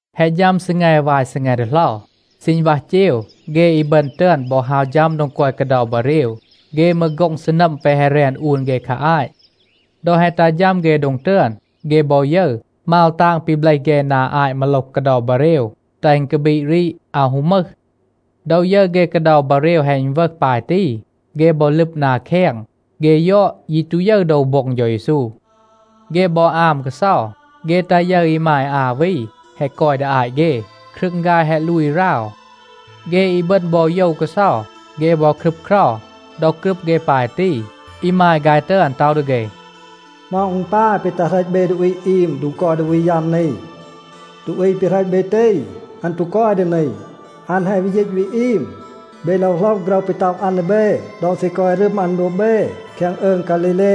แฮะ ฌัม ซีแง วาย ซีแง ดีเหลา, ซีณวัห เจว, เฆ อีบึณ ตึอน บอ ฮาว ฌัม โดง กอย กาเดา บาเรว. เฆ มืร โฆ็ง ซีนัม แปะ แฮะ แรน อูน เฆ คา อาต. ดอ แฮะ ตัห ฌัม เฆ โดง ตึอน, เฆ บอ ยึร, มาว ตาง ปี เบลห เฆ นา อาต มาโลห กาเดา บาเรว, แตห อึณ กาบีด รีด, อาว ฮู มึห. ดอ ยึร เฆ กาเดา บาเรว แฮะ อึณวึห ปาย ตี, เฆ บอ ลึบ นา แคง. เฆ ยอด, ยี ตู ยึร โดว โบ็ง เฌา เยซู. เฆ บอ อาม กาเซา. เฆ ตา ยึร อีมาย อา วี แฮะ กอย ดี อาต เฆ. ครึง ฆาย แฮะ ลูย ราว. เฆ อีบึณ บอ โยว กาเซา. เฆ บอ ครึบเครา. ดอ กรึบ เฆ ปาย ตี, อีมาย ฆาย ตึอน ต็อห ดี เฆ, “เหมา อึณ ปาย ปี ตัห เหรต เบ ดูอี อีม โดง กอย ดูอี ยัม นี? ดูอี ปี เหรต เบ ตี, อัน ตู กอย ดี นี. อัน แฮะ วี ยีต วี อีม. เบ โลว โหลห โฆรห ปี ต็อห อัน ดี เบ ดอ ซี กอย รึม อัน โดบ เบ แคง อืง ฆาลีเล.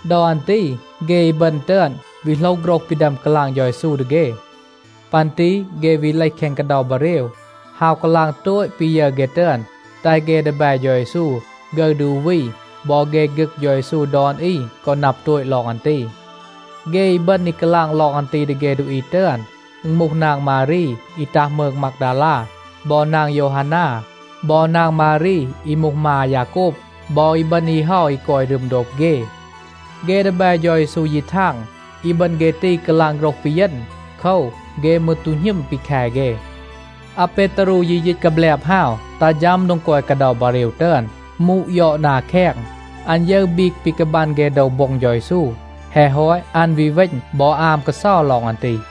ดอ อัน ตี เฆ อีบึณ ตึอน วี โหลห โฆรห ปี ดึอม กาลาง เฌา เยซู ดี เฆ. ปัน ตี เฆ วี เลห แคง กาเดา บาเรว, ฮาว กาลาง โตต ปี ยึร เฆ ตึอน, แตห เฆ ดีแบ เฌา เยซู ฆึร ดี อู วี บอ เฆ ฆึก เฌา เยซู ดอน อี กอ นับ โตต ลอง อัน ตี. เฆ อีบึณ อี กาลาง ลอง อัน ตี ดี เฆ ดูอี ตึอน, อึณ มูห นาง มารี อี ตัห มืง มากดาลา, บอ นาง โยวฮานา, บอ นาง มารี อี มูห มา อายาโกบ, บอ อีบึณ อี เฮา อี กอย รึม โดบ เฆ. เฆ ดีแบ เฌา เยซู ยี ทาง, อีบึณ เฆ ตี กาลาง โฆรห ปีเยณ. โคว, เฆ มืร ตู หณึม ปี แค เฆ. อาเปตารู ยี ยีต กาแบลบ ฮาว, ตัห ฌัม โดง กอย กาเดา บาเรว ตึอน, มูด ยอด นา แคง. อัน ยึร บีก ปี กาบัน เฆ โดว โบ็ง เฌา เยซู. แฮะ ฮอต, อัน วี เวณ บอ อาม กาเซา ลอง อัน ตี.a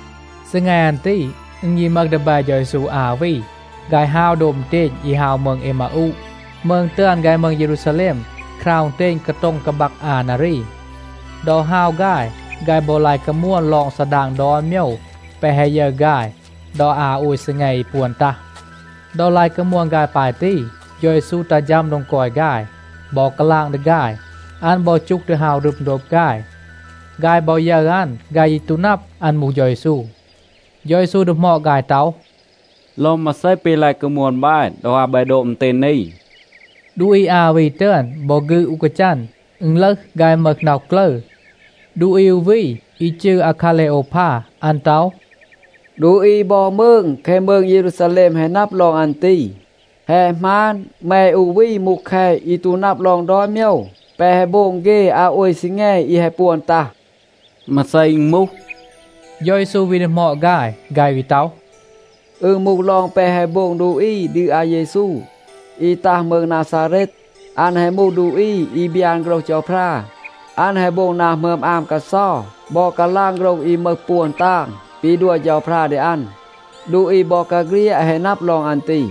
ซีแง อัน ตี, อึณ ยี มึห ดีแบ เฌา เยซู อา วี, ฆาย ฮาว โดบ อึณเตณ อี ฮาว มืง เอมาอูะ. มืง ตึอน ฆาย มืง เยรูซาแลม, คราว อึณเตณ กาโต็ง กาบัก อา นารี.b ดอ ฮาว ฆาย, ฆาย บอ ลาย กามวน ลอง ซาดาง ดอน โมยว แปะ แฮะ ยึร ฆาย ดอ อา โอย ซีแง อี ปวน ตัห. ดอ ลาย กามวน ฆาย ปาย ตี, เฌา เยซู ตัห ฌัม โดง กอย ฆาย บอ กาลาง ดี ฆาย. อัน บอ จูห ดี ฮาว รึม โดบ ฆาย. ฆาย บอ ยึร อัน, ฆาย ยี ตู นับ, อัน มูห เฌา เยซู. เฌา เยซู ดีหมอด ฆาย ต็อห, “ลอง มาเซ ปี ลาย กามวน บาย ดอ ฮาว บาย โดบ อึณเตณ นี?” ดูอี อา วี ตึอน บอ ฆืด อู กาจัน, อึณ ลึห, ฆาย มึห น็อห กลึร. ดูอี อู วี อี จืร อาคาเลโอวพา, อัน ต็อห, “ดูอี บอ มืง แคง มืง เยรูซาแลม แฮะ นับ ลอง อัน ตี. แฮะ หมาน, แม อู วี มูห แคต อี ตู นับ ลอง ดอน โมยว แปะ แฮะ โบง เฆ อา โอย ซีแง อี แฮะ ปวน ตัห?” “มาเซ อึณ มูห?” เฌา เยซู วี ดีหมอด ฆาย. ฆาย วี ต็อห, “อึณ มูห ลอง แปะ แฮะ โบง ดูอี ดี อาเยซู, อี ตัห มืง นาซาเรต. อัน แฮะ มูห ดูอี อี บยาน โฆรห เฌาพรา. อัน แฮะ โบง นา หมึอม อาม กาเซา บอ กาลาง โฆรห อี มึห ปวน ตาง ปี ดัว เฌาพรา ดี อัน. ดูอี บอกาเฆลียด แฮะ นับ ลอง อัน ตี.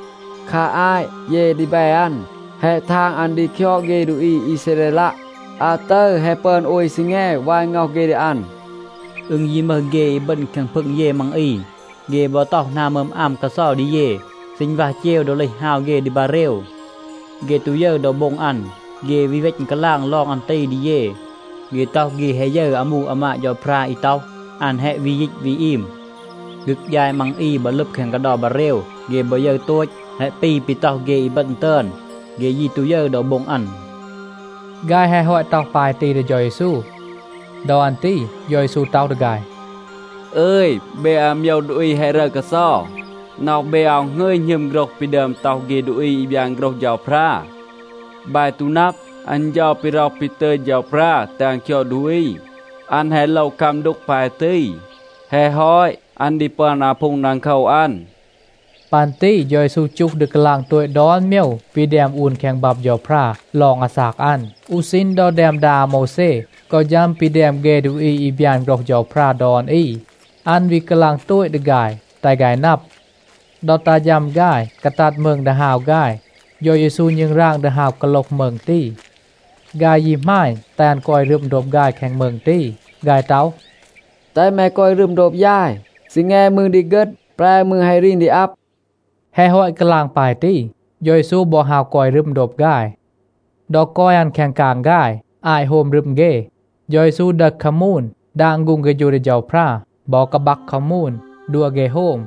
คา อาต เย ดีแบ อัน แฮะ ทาง อัน ดี คยอด เฆ ดูอี อีซาเรลัะ. อาตึร แฮะ ปึอน โอย ซีแง วาย ง็อห เฆ ดี อัน. อึณ ยี มึห เฆ อีบึณ แคง พึง เย มัง อี, เฆ บอ ต็อห นา หมึอม อาม กาเซา ดี เย. ซีณวัห เจว ดอ เลห ฮาว เฆ ดี บาเรว, เฆ ตู ยึร โดว โบ็ง อัน. เฆ วี เวณ กาลาง ลอง อัน ตี ดี เย. เฆ ต็อห, เฆ แฮะ ยึร อามู อามาด เฌาพรา อี ต็อห, อัน แฮะ วี ยีต วี อีม. ฆึก ยาย มัง อี บอ ลึบ แคง กาเดา บาเรว, เฆ บอ ยึร โตต, แฮะ ปี ปี ต็อห เฆ อีบึณ ตึอน. เฆ ยี ตู ยึร โดว โบ็ง อัน.” ฆาย แฮะ ฮอต ต็อห ปาย ตี ดี เฌา เยซู. ดอ อัน ตี เฌา เยซู ต็อห ดี ฆาย, “อึย, เบ อาโมยว ดูอี แฮะ รึร กาเซา, น็อห เบ อาว หงึย หณึม โฆรห ปี ดึอม ต็อห เฆ ดูอี อี บยาน โฆรห เฌาพรา. บาย ตู นับ, อัน เฌา ปี ร็อห ปี ตึย เฌาพรา แตห อัน คยอด ดูอี, อัน แฮะ โลว คัม ดูก ปาย ตี. แฮะ ฮอต, อัน ดี ปึอน อาพูง ดังโคว อัน.” ปัน ตี เฌา เยซู จูห ดี กาลาง โตต ดอน โมยว ปี แดม อูน แคง บับ เฌาพรา ลอง อาซาก อัน, อู ซีณ ดอ แดม ดา อาโมวแซ กอ ฌัม ปี แดม เฆ ดูอี อี บยาน โฆรห เฌาพรา ดอน อี, อัน วี กาลาง โตต ดี ฆาย, แตห ฆาย นับ. ดอ ตัห ฌัม ฆาย กาตัด มืง ดี ฮาว ฆาย, เฌา เยซู ณึงราง ดี ฮาว กาโลห มืง ตี. ฆาย ยี หมาณ, แตห อัน กอย รึม โดบ ฆาย แคง มืง ตี. ฆาย ต็อห, “แตห แม กอย รึม โดบ ยาย, ซีแง มืร ดี เฆต. แปร มืร แฮะ รีน ดี อับ.” แฮะ ฮอต กาลาง ปาย ตี, เฌา เยซู บอ ฮาว กอย รึม โดบ ฆาย. ดอ กอย อัน แคง กาง ฆาย, อาต โฮม รึม เฆ, เฌา เยซู ดึห คามูน, ดาง ฆูง เฆฌู ดี เฌาพรา, บอ กาบัก คามูน, ดัว เฆ โฮม.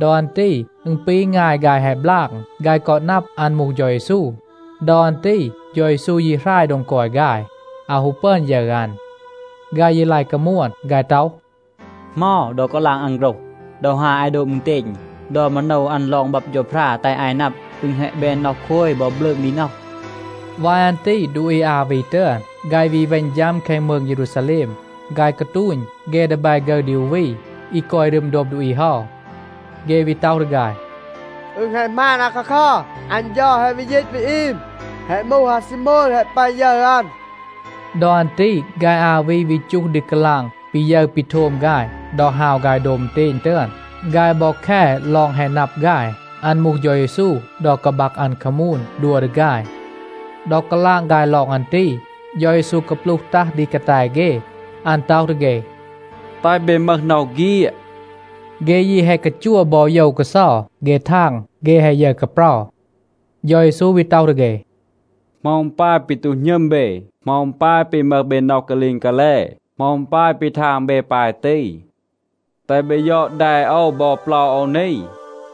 ดอ อัน ตี อึณ ปี งาย ฆาย แฮะ บลาง. ฆาย กอ นับ อัน มูห เฌา เยซู. ดอ อัน ตี เฌา เยซู ยี หราย โดง กอย ฆาย, อาว ฮู ปึอน ยึร อัน. ฆาย ยี ลาย กามวน. ฆาย ต็อห, “เหมา, ดอ กาลาง อัน โฆรห, ดอ ฮาว อาย โดบ อึณเตณ, ดอ มาโนว อัน ลอง บับ เฌาพรา แตห อาย นับ, อึณ แฮะ แบน น็อห โคย บอ บลืง ดี น็อห.” วาย อัน ตี ดูอี อา วี ตึอน, ฆาย วี เวณ ฌัม แคง มืง เยรูซาแลม. ฆาย กาตูณ เฆ ดีแบ ฆึร ดี อู วี อี กอย รึม โดบ ดูอี เฮา. เฆ วี ต็อห ดี ฆาย, “อึณ แฮะ หมาน อาคาคัร, อัน เฌา แฮะ วี ยีต วี อีม. แฮะ มูห, อาซีโมน แฮะ ปึอน ยึร อัน.” ดอ อัน ตี ฆาย อา วี วี จูห ดี กาลาง ปี ยึร ปี โทม ฆาย ดอ ฮาว ฆาย โดบ อึณเตณ ตึอน. ฆาย บอ แค ลอง แฮะ นับ ฆาย อัน มูห เฌา เยซู ดอ กาบัก อัน คามูน, ดัว ดี ฆาย. ดอ กาลาง ฆาย ลอง อัน ตี, เฌา เยซู กาปลูห ตัห ดี กาแต เฆ. อัน ต็อห ดี เฆ, “แตห เบ มึห น็อห เฆียด.” เฆ ยี แฮะ กาจัว บอ โยว กาเซา. เฆ ทาง, เฆ แฮะ ยึร กาเปรา. เฌา เยซู วี ต็อห ดี เฆ, “เหมา อึณ ปาย ปี ตู หณึม เบ? เหมา อึณ ปาย ปี มึห เบ น็อห กาลีง กาแล? เหมา อึณ ปาย ปี ทาง เบ ปาย ตี? แตห เบ ยอด แด โอว บอ เปลา โอว นี,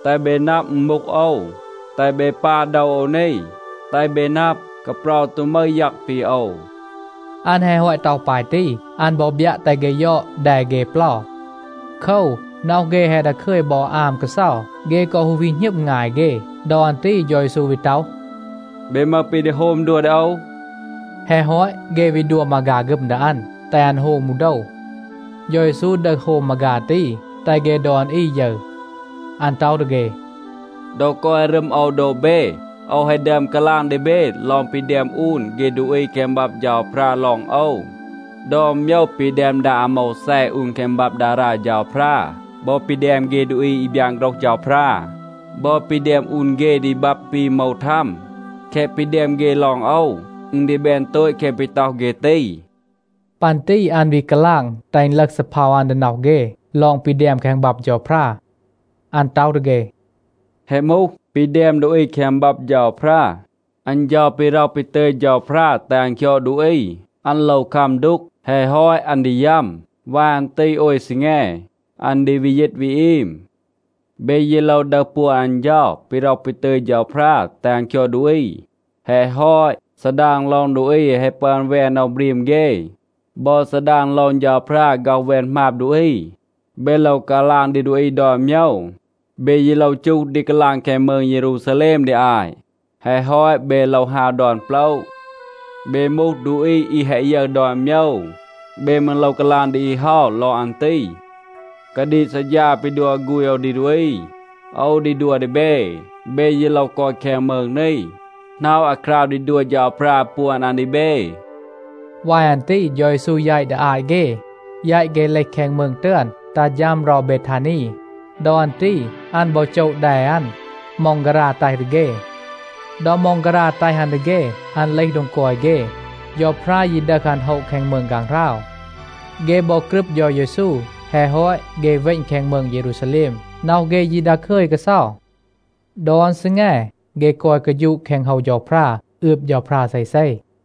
แตห เบ นับ, อึณ มูห โอว. แตห เบ ปา โดว โอว นี, แตห เบ นับ, กาเปรา ตู มึห ยัง ปี โอว.” อัน แฮะ ฮอต ต็อห ปาย ตี, อัน บอ บยัะ แตห เฆ ยอด แด เฆ เปลา.c โคว, น็อห เฆ แฮะ ดาคึย บอ อาม กาเซา. เฆ กอ ฮู วี หณึม งาย เฆ. ดอ อัน ตี เฌา เยซู วี ต็อห, “เบ มึห ปี ดี โฮม ดัว ดี โอว?” แฮะ ฮอต, เฆ วี ดัว มาฆา ฆึม ดี อัน, แตห อัน โฮม อู โดว. เฌา เยซู ดึห โฮม มาฆา ตี, แตห เฆ ดอน อี ยึร. อัน ต็อห ดี เฆ, “ดอ กอย รึม โอว โดบ เบ, โอว แฮะ ดึอม กาลาง ดี เบ ลอง ปี แดม อูน เฆ ดูอี แคง บับ เฌาพรา ลอง โอว. ดอน โมยว ปี แดม ดา อาโมวแซ อูน แคง บับ ดารา เฌาพรา บอ ปี แดม เฆ ดูอี อี บยาน โฆรห เฌาพรา บอ ปี แดม อูน เฆ ดี บับ ปี โหมว ทัม, แคะ ปี แดม เฆ ลอง โอว, อึณ ดี แบน โตต แคะ ปี ต็อห เฆ ตี.” ปัน ตี อัน วี กาลาง, แตห อึณ ลึห ซีเพา อัน ดี น็อห เฆ ลอง ปี แดม แคง บับ เฌาพรา. อัน ต็อห ดี เฆ, “แฮะ มูห, ปี แดม ดูอี แคง บับ เฌาพรา. อัน เฌา ปี ร็อห ปี ตึย เฌาพรา แตห อัน คยอด ดูอี, อัน โลว คัม ดูก. แฮะ ฮอต, อัน ดี ยัม. วาย อัน ตี โอย ซีแง, อัน ดี วี ยีต วี อีม. เบ ยี โลว ดึห ปวน อัน เฌา ปี ร็อห ปี ตึย เฌาพรา แตห อัน คยอด ดูอี. แฮะ ฮอต, ซาดาง ลอง ดูอี แฮะ ปึอน แวน น็อห บรีม เฆ, บอ ซาดาง ลอง เฌาพรา ฆ็อห แวน หมาบ ดูอี, เบ โลว กาลาง ดี ดูอี ดอน โมยว. เบ ยี โลว จูห ดี กาลาง แคง มืง เยรูซาแลม ดี อาต, แฮะ ฮอต, เบ โลว ฮาว ดอน โปละ. เบ มูห ดูอี อี แฮะ ยึร ดอน โมยว, เบ มืร โลว กาลาง ดี อี เฮา ลอง อัน ตี. กาดีก ซัดฌา ปี ดัว ฆูณ โอว ดี ดูอี, โอว ดี ดัว ดี เบ. เบ ยี โลว กอย แคง มืง นี, หน็อะ อาคราว ดี ดัว เฌาพรา ปวน อัน ดี เบ.” วาย อัน ตี เฌา เยซู แยต ดี อาต เฆ, แยต เฆ เลห แคง มืง ตึอน ตัห ฌัม เรา เบทานี. ดอ อัน ตี อัน บอ โจะ แด อัน, ม็องการา แตห ดี เฆ. ดอ ม็องการา แตห อัน ดี เฆ, อัน เลห โดง กอย เฆ. เฌาพรา ยี ดึห อัน โฮะ แคง มืง ฆางหราว. เฆ บอ กรึบ เฌา เยซู. แฮะ ฮอต, เฆ เวณ แคง มืง เยรูซาแลม. น็อห เฆ ยี ดาคึย กาเซา. ดอน ซีแง เฆ กอย กาฌูะ แคง โฮว เฌาพรา, อืบ เฌาพรา เซเซ.